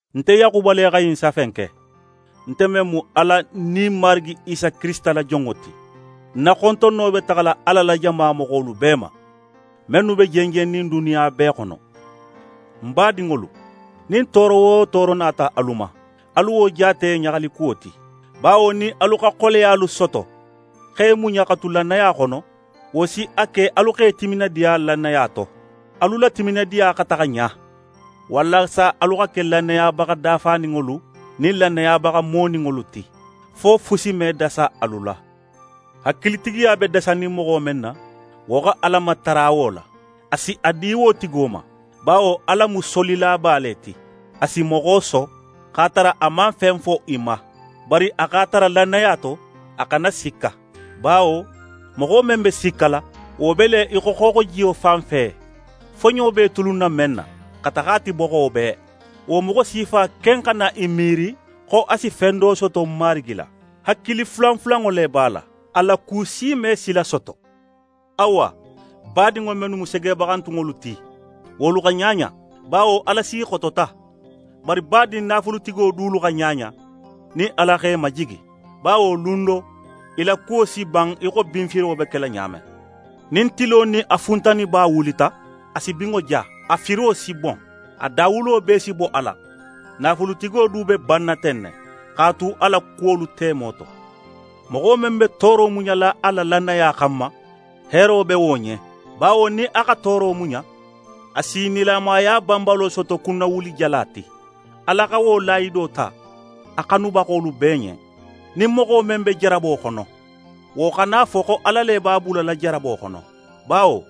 Nte Yaxuba le xa ɲin safe in ke, nte men mu Ala nin Marigi Isa Kirisita la jonŋo ti. Ń na xontonno be taxala Ala la jama moxolu bee ma, mennu be jenjennin duniya bee xono. Ń badinŋolu, nin tooro wo tooro nata alu ma, alu wo jaate ɲaxalikuwo ti; bawo nin alu xa xoleyalu soto x'e muɲa xa tu lannaya xono, wo si a ke alu x'e timinadiya lannaya to. Alu la timinadiya xa taxa ɲa, walasa alu xa ke lannayabaxa dafaninŋolu nin lannayabaxa moninŋolu ti, fo fusi me dasa alu la. Hakilitigiya be dasanin moxo men na, wo xa Ala matara wo la, a si a di wo tigo ma; bawo Ala mu solilaba le ti, a si moxo so, x'a tara a man fen fo í ma. Bari a x'a tara lannaya to, a xana sikka. Bawo moxo men be sikkala, wo be le í xo xooxojiyo fanfe, foɲo be í tulunna men na, xa taxa a ti boxo bee. Wo moxo sifa ken xana í miiri xo a si fen do soto Marigi la. Hakili fulanfulanŋo le b'a la; a la ku si me sila soto. Awa, badinŋo mennu mu segebaxantunŋolu ti, wolu xa ɲaɲa; bawo Ala s'i xotota. Bari badin naafulutigo dulu xa ɲaɲa, nin Ala x'e majigi. Bawo lun do, i la kuwo si ban í xo binfiro be kela ɲa men. Nin tilo nin a funtaniba wulita, a si binŋo ja, a firo si bon. A dawulo bee si bo a la. Naafulutigo du be banna ten ne, x'a tu a la kuwolu temo to. Moxo men be tooro muɲala a la lannaya xanma, heero be wo ɲen; bawo nin a xa tooro muɲa, a si nilamaya banbalo soto kunnawulijala ti. Ala xa wo lahido ta a xanubaxolu bee ɲen. Nin moxo men be jarabo xono, wo xana a fo xo Ala le b'a bulala jarabo xono; bawo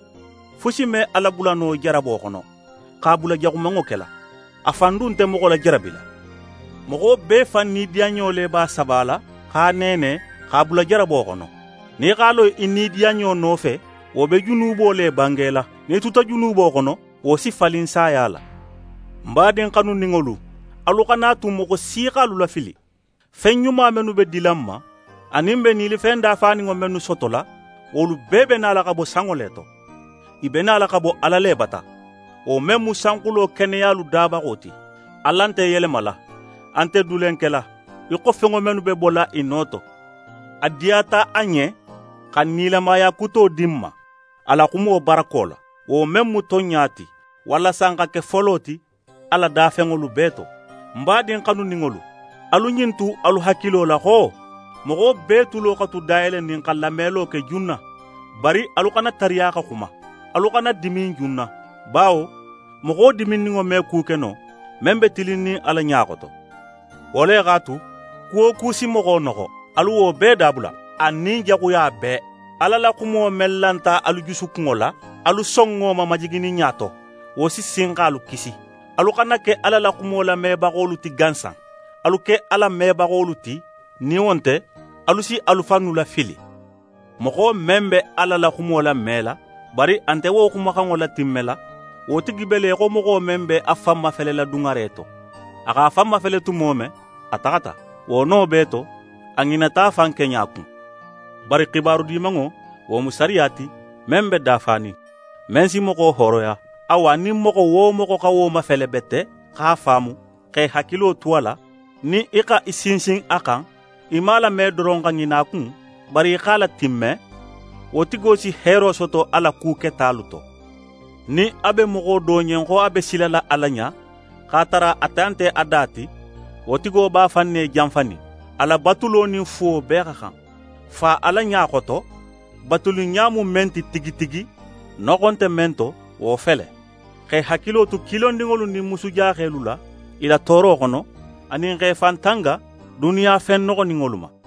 fusi me Ala bula no jarabo xono, x'a bula jaxumanŋo kela, a fan du nte moxo lajarabila. Moxo bee fan nidiyanɲo le b'a sabala x'a neene, x'a bula jarabo xono. Nin í x'a lo í nidiyanɲo nofe, wo be junubo le bangela. Nin í tuta junubo xono, wo si falin saya la. Ń badin xanuninŋolu, alu xana a tu moxo si x'alu lafili. Fen ɲuma mennu be dila n ma, anin n be nilifen dafaninŋo mennu sotola, wolu bee be nala xa bo sanŋo le to. I be nala xa bo Ala le bata, wo men mu sanxulo keneyalu dabaxo ti. Ala nte yelemala, a nte dulen kela, í xo fenŋo mennu be bola i no to. A diyata a ɲen xa nilamaya kuto di n ma a la xumo barako la, wo men mu tonɲa ti, walasa n xa ke folo ti a la dafenŋolu bee to. Ń badin xanuninŋolu, alu ɲin tu alu hakilo la xo: Moxo bee tulo xa tu dayelenin xa lamelo ke junna, bari alu xana tariya xa xuma, alu xana dimin junna. Bawo moxo diminninŋo me ku ke no, men be tilinnin Ala ɲa xoto. Wo le x'a tu, ku wo ku si moxo noxo, alu wo bee dabula, anin jaxuya bee. Ala la xumo men lanta alu jusukunŋo la, alu son wo ma majigininɲa to; wo si sin x'alu kisi. Alu xana ke Ala la xumo lamebaxolu ti gansan, alu ke a latimmebaxolu ti; nin wo nte, alu si alu fannu lafili. Moxo men be Ala la xumo lamela, bari a nte wo xumaxanŋo latimmela, wo tigi be le í xo moxo men b'a fan mafelela duŋare to. A x'a fan mafele tumo men, a taxata, wo no bee to, a ŋinata a fan keɲa kun. Bari xibaru Dimanŋo, wo mu sariya ti, men be dafanin, men si moxo hooroya. Awa, nin moxo wo moxo xa wo mafele bete x'a faamu, xa í hakilo tu a la, nin í xa í sinsin a xan, í man a lame doron xa ŋina a kun, bari í x'a latimme, wo tigo si heero soto a la ku ketalu to. Nin a be moxo do ɲen xo a be silala Ala ɲa, x'a tara a ta nte a da ti, wo tigo b'a fan ne janfanin. A la batulo nin fuwo bee xa xan. Fa Ala ɲa xoto batuliɲa mu men ti tigi tigi, noxo nte men to, wo fele: Xa í hakilo tu kilondinŋolu nin musujaxelu la, i la tooro xono, anin xa í fan tanga duniya fen noxoninŋolu ma.